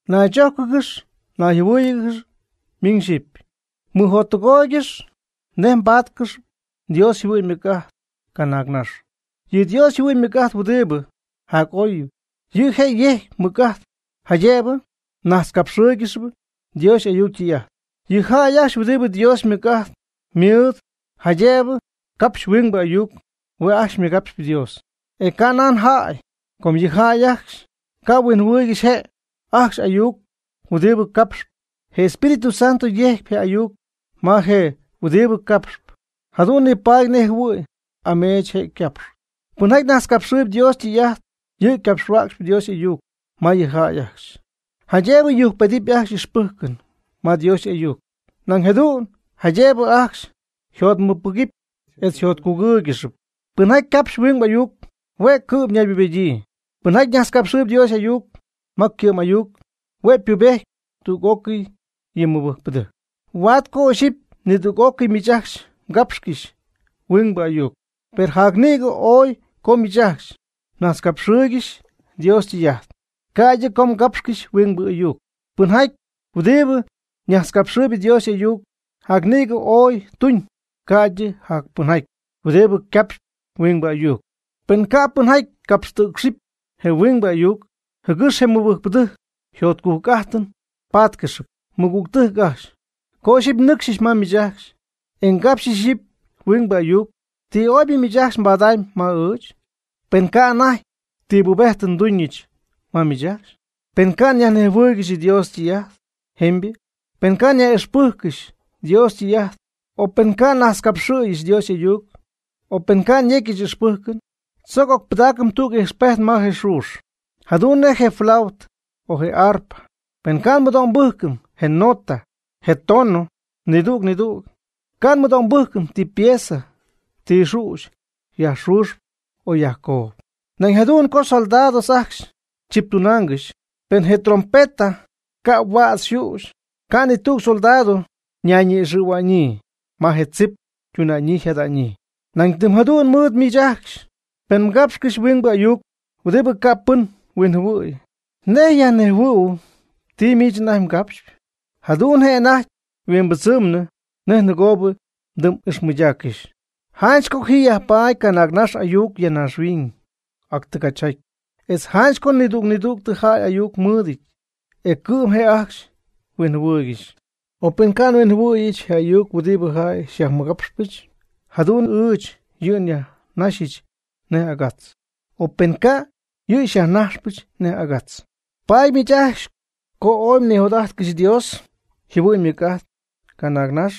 Naychójcɨgɨxy nayjɨhuɨ́ɨyɨgɨxy miñ xyipy. Mɨjottɨgooygɨxy nej mbaatcɨxy Dios yjɨhuɨ'ñ ymɨc'ajt canaagnax. Yɨ Dios yjɨhuɨ'ñ ymɨc'ajt huɨdibɨ jac'oybɨ, yɨ' je' yejcpy mɨc'ajt jaydëbɨ mnajtzcapxɨɨygɨxy Dios y'ayuc ytɨy'ajt. Yɨ jäy ajcxy huɨdibɨ Dios ymɨc'ajt mɨɨd jaydëbɨ capxy huing ayuc, hue' ajcxy ymɨgapxyp Dios, e ca' nan jäy, com yɨ jäy ajcxy ca' huinjɨhuɨɨygɨxy je' ajcxy y'ayuc huɨdibɨ capxp. Je Espíritu Santo yejcp je ayuc ma je huɨdibɨ capxp. Jadu'n nipaady nej jɨhuɨ̈y ameech je' ycapxy. Pɨnjaty najtzcapxɨɨyb Dios ytɨy'ajt, yɨ' ycapxhuäcxyp Dios y'ayuc ma yɨ jäy ajcxy, jaydëbɨ yujcpedɨpy ajcxy y'ixpɨjcɨn ma Dios y'ayuc, nañ jadu'n jaydëbɨ ajcxy yjotmɨcpɨgɨpy etz yjotcugɨ́ɨygɨxɨpy. Pɨnjaty capxp huing ayuc, hue' cɨ'm naybubedyii. Pɨnjaty najtzcapxɨɨyb Dios y'ayuc ma ycɨ'm ayuc, hue' ypubejtyp tüg'ócɨy yɨ mɨbɨjcpɨdɨjc. Huaad co ixyipy nidüg'ócɨy miich ajcxy mgapxcɨxy huingbɨ ayuc. Per jac nïgɨ oy co miich ajcxy mnajtzcapxɨɨygɨxy Dios ytɨy'ajt, ca'ydɨ co mgapxcɨxy huingbɨ ayuc. Pɨnjaty huɨdibɨ najtzcapxɨɨyb Dios y'ayuc, jac nïgɨ oy tuñ, ca'ydɨ jac pɨnjaty huɨdibɨ capxy huingbɨ ayuc, pen ca' pɨnjaty capxtɨ̈cxɨpy je huingbɨ y'ayuc, jɨgɨx je mɨbɨjcpɨdɨjc jotcujc'ajtɨn pátcɨxɨp. Mɨgügtɨjc ajcxy, co ixyipy nnɨcxyɨch ma miich ajcxy, e ngapxyɨch ixyipy huingbɨ ayuc, ¿ti oybɨ miich ajcxy mbadamyb ma ɨɨch? Pen ca' anajty ti pubejtɨn nduñɨch ma miich ajcxy, pen ca' nyajnejhuɨɨygɨxy Dios ytɨy'ajt jemybɨ, pen ca' nyaj'ixpɨjccɨxy Dios ytɨy'ajt o pen ca' nnajtzcapxɨ̈yɨch Dios y'ayuc, o pen ca' nyecyɨch ixpɨjcɨn. Tzoc ocpɨdaacɨm tüg ijxpejt ma je xüxy, jadu'n nej je flautɨ o je arpa. Pen ca' nmɨdo'mbɨjcɨm je nota je tono nidüg nidüg, ca' nmɨdo'mbɨjcɨm ti pieza ti xüxy yajxuxp o yajcoob. Nañ jadu'n co soldados ajcxy chiptunaangɨxy, pen je trompeta ca' huädz yxüxy, ca' ni tüg soldado ñayñi'ixɨ̈hua'ñyii ma je tzip ytuna'ñyii yjada'ñyii. Nañ tɨm jadu'n mɨɨd miich ajcxy, pen mgapxcɨxyp huingbɨ ayuc huɨdibɨ ca' pɨn huinjɨhuɨ̈y, ¿nej yajnejhuɨ̈huɨpy ti miich anajty mgapxyp? Jadu'n je' anajty yhuimbɨdzɨmnɨ nej nɨgoob mdɨm'ixmɨydaaccɨxy. Janch co ji yajpaady canaagnax ayuc ya naaxhuiñ ac tɨgachjaty. Etz janch co nidüg nidüg jäy ayuc mɨɨdɨty e cɨ'm je' ajcxy huinjɨhuɨɨygɨxy. Per pen ca' nhuinjɨhuɨ̈yɨch je ayuc huɨdibɨ jäy xyajmɨgapxpɨch jadu'n ɨɨch yɨ' nyajnaxyɨch nej agatz. O pen ca', yɨ' xyajnajxpɨch nej agatz. Paady miich ajcxy co ooy mnijot'ajtcɨxy Dios yjɨhuɨ'ñ ymɨc'ajt canaagnax,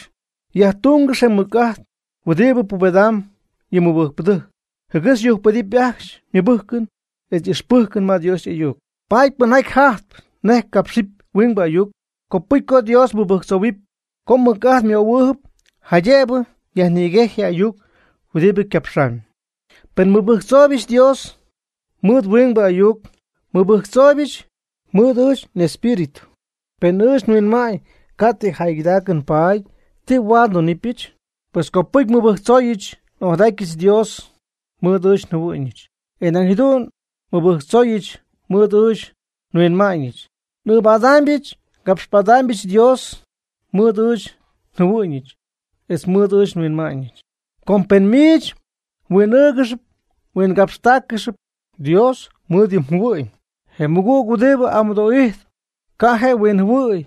yajtungɨx je mɨc'ajt huɨdibɨ pubedam yɨ mɨbɨjcpɨdɨjc, jɨgɨx yujcpedɨpy ajcxy ymɨbɨjcɨn etz y'ixpɨjcɨn ma Dios y'ayuc. Paady pɨnjaty jajtp nej capxɨp huingbɨ ayuc, copɨcy co Dios mɨbɨjctzohuɨpy co mɨc'ajt ymöhuɨɨb, jaydëbɨ yajnïguejy je ayuc huɨdibɨ ycapxamyb. Pen nmɨbɨjctzooybɨch Dios mɨɨd huingbɨ ayuc, nmɨbɨjctzooybɨch mɨɨd ɨɨch n'espíritu, per ɨɨch nhuinma'ñ ca' ti jäygɨdaacɨn paady. ¿Ti huaad ndunɨpyɨch? Pues copɨcy nmɨbɨjctzooyɨch n'ojadatyɨch Dios mɨɨd ɨɨch njɨhuɨ'ñɨch, e nañ jadu'n nmɨbɨjctzooyɨch mɨɨd ɨɨch nhuinma'ñɨch. N'ɨɨbadaamyɨch ngapxpadaamyɨch Dios mɨɨd ɨɨch njɨhuɨ'ñɨch etz mɨɨd ɨɨch nhuinma'ñɨch. Com pen miich mhuin'ɨɨgɨxyp mhuingapxtaaccɨxyp Dios mɨɨd yɨ mjɨhuɨ'ñ, je mɨgüg huɨdibɨ amɨdoo'ijtp ca' je' huinjɨhuɨ̈y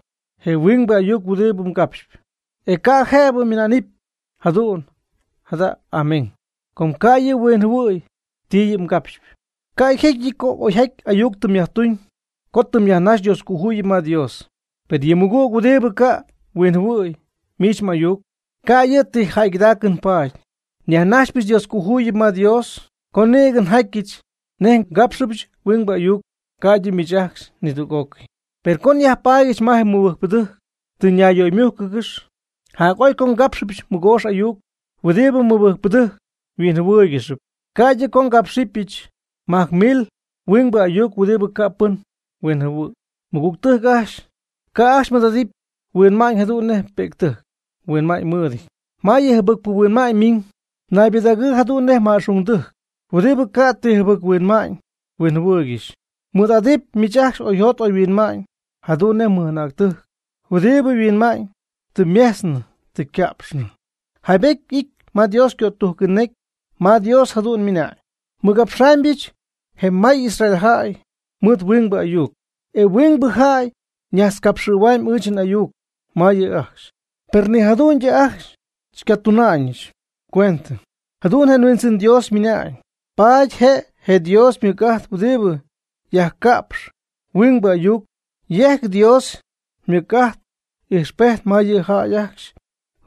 je huing ayuc huɨdibɨ mgapxyp, e ca' jëbɨ ymɨna'nɨp “jadu'n jada, Amén.” Com ca' yɨ' huinjɨhuɨ̈y ti yɨ' mgapxyp. Ca' yjecyɨty co oyjaty ayuc tɨ myajtuñ co tɨ myajnaxy Dioscojuyip ma Dios, per yɨ mmɨgüg huɨdibɨ ca' huinjɨhuɨ̈y miich m'ayuc ca' yɨ' ti jäygɨdaacɨn paady. Nyajnajxypɨch Dioscojuyip ma Dios co nïgɨ njatyɨch nej ngápxɨbyɨch huingbɨ ayuc, ca'ydɨ miich ajcxy nidüg'ócɨy. Per co nyajpaadyɨch ma je mɨbɨjcpɨdɨjc tɨ ñayyöymújcɨgɨxy, jac'oy co ngapxyɨch mɨgoox ayuc huɨdibɨ mɨbɨjcpɨdɨjc yhuinjɨhuɨɨygɨxyp, ca'ydɨ co ngápxɨbɨch majc mil huingbɨ ayuc huɨdibɨ ca' pɨn huinjɨhuɨ̈y. Mɨgügtɨjc ajcxy, ca' ajcxy mmɨɨd'adɨpy mhuinma'ñ, jadu'n nej pi'ctɨjc yhuinma'ñ mɨɨdɨty. Ma yɨ jɨbɨcpɨ huinma'ñ ymiñ naybɨdägɨɨ jadu'n nej ma'xungdɨjc huɨdibɨ ca' ti jɨbɨc huinma'ñ huinjɨhuɨɨygɨxy. Mɨɨd'adɨp miich ajcxy oyjot oyhuinma'ñ jadu'n nej mɨj'anäctɨjc huɨdibɨ yhuinma'ñ tɨ ymejtznɨ tɨ yca'pxnɨ. Jaybety y'ity ma Dios ycötujcɨn necy ma Dios jadu'n ymɨna'ñ: “Nmɨgapxaamybɨch je may Israel jäy mɨɨd huingbɨ ayuc, e huingbɨ jäy najtzcapxɨ̈huamb ɨɨch n'ayuc ma yɨ' ajcxy, per ni jadu'n ajcxy xycatuna'ñɨch cuendɨ.” Jadu'n je Huindzɨn Dios ymɨna'ñ. Paady je' je Dios ymɨc'ajt huɨdibɨ yajcapxp huingbɨ ayuc, yejcp Dios ymɨc'ajt ijxpejt ma yɨ jäy ajcxy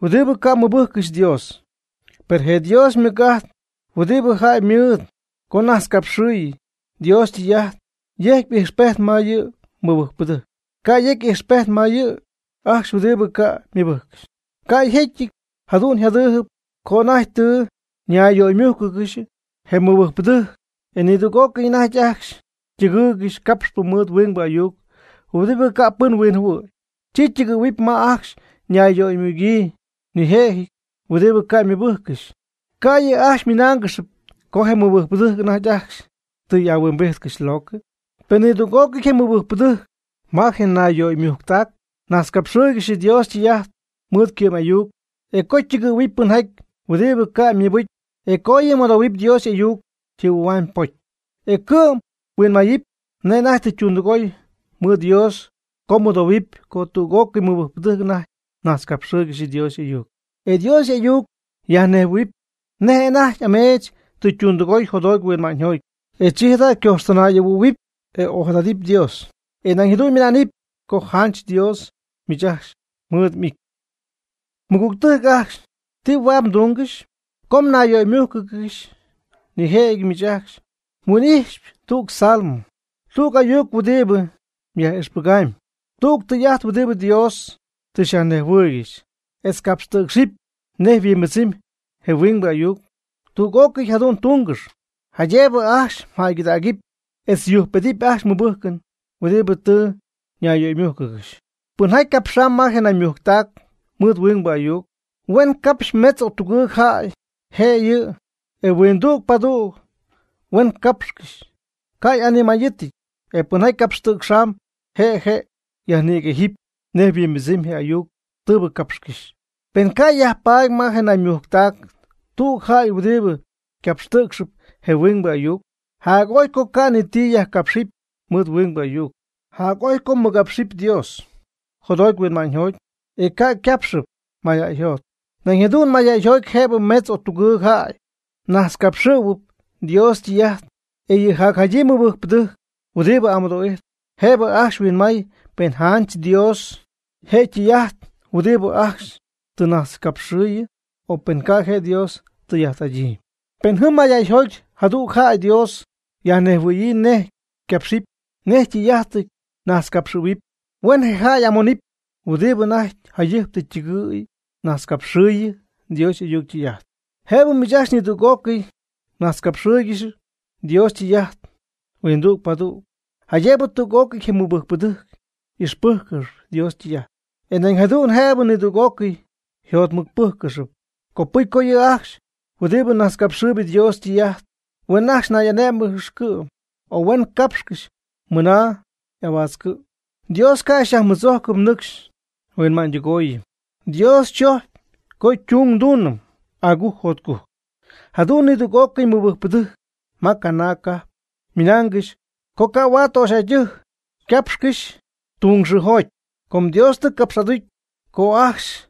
huɨdibɨ ca' mɨbɨjccɨxy Dios. Per je Dios ymɨc'ajt huɨdibɨ jäy ymɨɨd co najtzcapxɨ̈y Dios ytɨy'ajt, yejcp ijxpejt ma yɨ mɨbɨjcpɨdɨjc, ca' yecy ijxpejt ma yɨ' ajcxy huɨdibɨ ca' ymɨbɨjccɨxy. Ca' yjecyɨty jadu'n yjadɨp, co anajty tɨ ñayyöymújcɨgɨxy je mɨbɨjcpɨdɨjc, e nidüg'ócɨy anajty ajcxy ytɨgɨɨygɨxy capxpɨ mɨɨd huingbɨ ayuc huɨdibɨ ca' pɨn huinjɨhuɨ̈y, chi ytɨgɨ̈huɨp ma ajcxy ñayyöymugyii nijëjɨty huɨdibɨ ca' ymɨbɨjccɨxy. ¿Ca' yɨ' ajcxy ymɨnáangɨxyɨpy co je mɨbɨjcpɨdɨjc anajty ajcxy tɨ y'ahuimbijtcɨxy locɨ? Pen nidüg'ócɨy je mɨbɨjcpɨdɨjc ma je nayyöymujctac najtzcapxɨɨygɨxy Dios ytɨy'ajt mɨɨd ycɨ'm ayuc, e co ytɨgɨ̈huɨpy pɨnjaty huɨdibɨ ca' ymɨbɨcy, e co yɨ' mɨdohuɨpy Dios y'ayuc yjɨhuɨ̈huamyb ypocy. E cɨ'm huinmayɨp nej anajty tɨ ytundɨgooy mɨɨd Dios co mɨdohuɨpy co nidüg'ócɨy mɨbɨjcpɨdɨjc anajty najtzcapxɨɨygɨxy Dios y'ayuc. E Dios y'ayuc yajnejhuɨ̈huɨɨb nej anajty ameech tɨ ytundɨgooy jotjoty huinma'ñyjoty. E chi jada' ycojxtinay'ɨhuɨ̈huɨpy, e ojadadɨpy Dios, e nañ jadu'n ymɨna'nɨp co janch Dios miich ajcxy xymɨɨd'ijtp. Mɨgügtɨjc ajcxy, ¿ti huaad mdúngɨxɨpy? Co mnayyöymújcɨgɨxɨpy, nijëjɨty miich ajcxy mhuin'ixɨpy tüg salmo, tüg ayuc huɨdibɨ yaj'ixpɨgamyb, tüg tɨy'ajt huɨdibɨ Dios tɨ xyajnejhuɨɨygɨxy, etz capxɨp huingbɨ ayuc, etz capxtɨ̈cxɨpy nej yhuimbɨdzɨmyb je huingbɨ ayuc. Tüg'ócɨy jadu'n tungɨx, jaydëbɨ ajcxy jäygɨdägɨpy etz yujcpedɨpy ajcxy ymɨbɨjcɨn huɨdibɨ tɨ ñayyöymújcɨgɨxy. Pɨnjaty capxamb ma je naymujctac mɨɨd huingbɨ ayuc, huen capxy metz o tugɨɨg jäy je'yɨ, e huindüg padüg huen capxcɨxy, ca' y'animayɨty. E pɨnjaty capxtɨ̈cxamb je' je' yajnïguejɨp nej yhuimbɨdzɨmyb je ayuc tɨɨbɨ capxcɨxy. Pen ca' yajpaady ma je nayyöymujctac tüg jäy huɨdibɨ capxtɨ̈cxɨp je huingbɨ ayuc, jac'oy co ca' ni ti yajcapxɨpy mɨɨd huingbɨ ayuc, jac'oy co mɨgapxɨp Dios jotjoty huinma'ñyjoty, e ca' capxɨp mayjäyjoty. Nañ jadu'n mayjäyjoty jëbɨ metz o tugɨɨg jäy najtzcapxɨ̈huɨp Dios ytɨy'ajt, e yɨ jacjadyii mɨbɨjcpɨdɨjc huɨdibɨ amɨdo'ijtp, jëbɨ ajcxy huinmay pen janch Dios je' ytɨy'ajt huɨdibɨ ajcxy tɨ najtzcapxɨ̈y, o pen ca' je' Dios tɨy'ajt'adyii. Pen jɨm mayjäyjoty jadüg jäy Dios yajnejhuɨ̈yii nej ycapxɨp, nej tɨy'ajt najtzcapxɨ̈huɨpy, huen je jäy y'amonɨpy huɨdibɨ anajty jayɨjp tɨ ytɨgɨ̈y najtxcapxɨɨyɨ Dios y'ayuc ytɨy'ajt. Jëbɨ miich ajcxy nidüg'ócɨy mnajtzcapxɨɨygɨxy Dios ytɨy'ajt huindüg padüg, jaydëbɨ tüg'ócɨy je mɨbɨjcpɨdɨjc ixpɨjccɨxy Dios ytɨy'ajt, e nañ jadu'n jëbɨ nidüg'ócɨy yjotmɨcpɨ́jccɨxɨpy. Copɨcy co yɨ' ajcxy huɨdibɨ najtzcapxɨɨyb Dios ytɨy'ajt, huen ajcxy nay'ané'mɨgɨx cɨ'm, e huen capxcɨxy mɨna y'ahuaatzcɨ̈y. Dios ca' xyajmɨdzojcɨm nɨcx nhuinma'ñydɨgooyɨm, Dios chojcpy co servicio ndunɨm agujc jotcujc. Jadu'n nidüg'ócɨy mɨbɨjcpɨdɨjc ma canaag cajp ymɨnaangɨxy co ca' huaad töxyjäydɨjc ycapxcɨxy serviciojoty, com Dios tɨ capx'aducy co ajcxy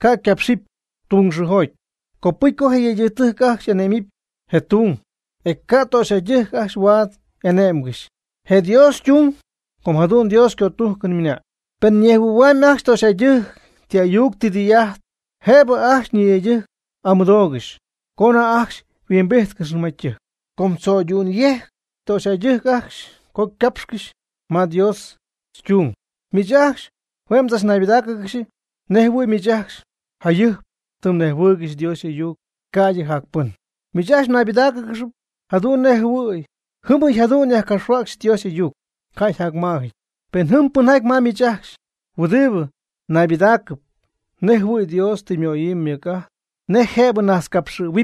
ca' ycapxɨpy serviciojoty. Copɨcy co je yëydɨjc ajcxy ane'mɨp je servicio, e ca' töxyjäydɨjc ajcxy huaad ane'mgɨxy je servicio, com jadu'n Dios ycötujcɨn ymɨna'ñ. Pen ñejhuɨ̈huamyb ajcxy töxyjäydɨjc ti ayuc ti tɨy'ajt, jëbɨ ajcxy ñiyëydɨjc amɨdoogɨxy co anajty ajcxy yhuimbijtcɨxnɨ ma ytɨjc, com tzo'ydu'n yejcp töxyjäydɨjc ajcxy co ycapxcɨxy serviciojoty. Miich ajcxy hue' mdzachnaybɨdáacɨgɨxy nej jɨhuɨ̈y miich ajcxy jayɨjp tɨm nejhuɨɨygɨxy Dios y'ayuc, ca'ydɨ jac pɨn. Miich ajcxy mnaybɨdáacɨgɨxy jadu'n nej jɨhuɨ̈y jɨmyɨ jadu'n yajcapxhuäcxy Dios y'ayuc, ca' yjacmaajɨty. Pen jɨm pɨnjaty ma miich ajcxy huɨdibɨ naybɨdaacɨp nejjɨhuɨ̈y Dios tɨ ymöyii mɨc'ajt nej jëbɨ najtzcapxɨ̈huɨpy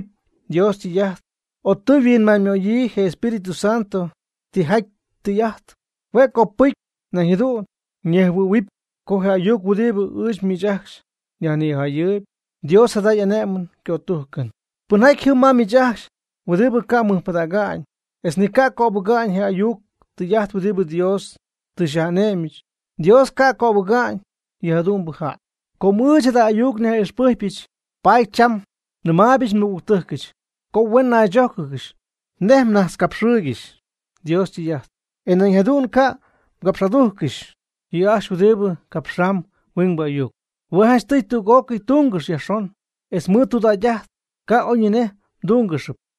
Dios ytɨy'ajt, o tɨ yhuinma'ñymöyii je Espíritu Santo tijaty tɨy'ajt, hue' copɨcy nañ jadu'n yñejhuɨ̈huɨpy co je ayuc huɨdibɨ ɨɨch miich ajcxy nyajnijayɨɨyb, Dios jada y'ane'mɨn ycötujcɨn. Pɨnjaty jɨm ma miich ajcxy huɨdibɨ ca' mɨjpɨdäga'ñ etz ni ca' cöbɨga'ñ je ayuc tɨy'ajt huɨdibɨ Dios tɨ xyaj'ane'myɨch, Dios ca' cöbɨga'ñ yɨjadu'mbɨ jäy. Com ɨɨch jada ayuc nyaj'ixpɨjcpɨch, paady cham nɨmaaybɨch nmɨgügtɨjcɨch, co huen najtzogɨɨygɨxy nej mnajtzcapxɨɨygɨxy Dios ytɨy'ajt, e nañ jadu'n ca' mgapx'adújccɨxɨpy yɨ' ajcxy huɨdibɨ capxamb huingbɨ ayuc. Hue' janchtɨy tüg'ócɨy tungɨxy yajxon, etz mɨɨd tudägy'ajt, ca' oyñinej mdúngɨxɨpy.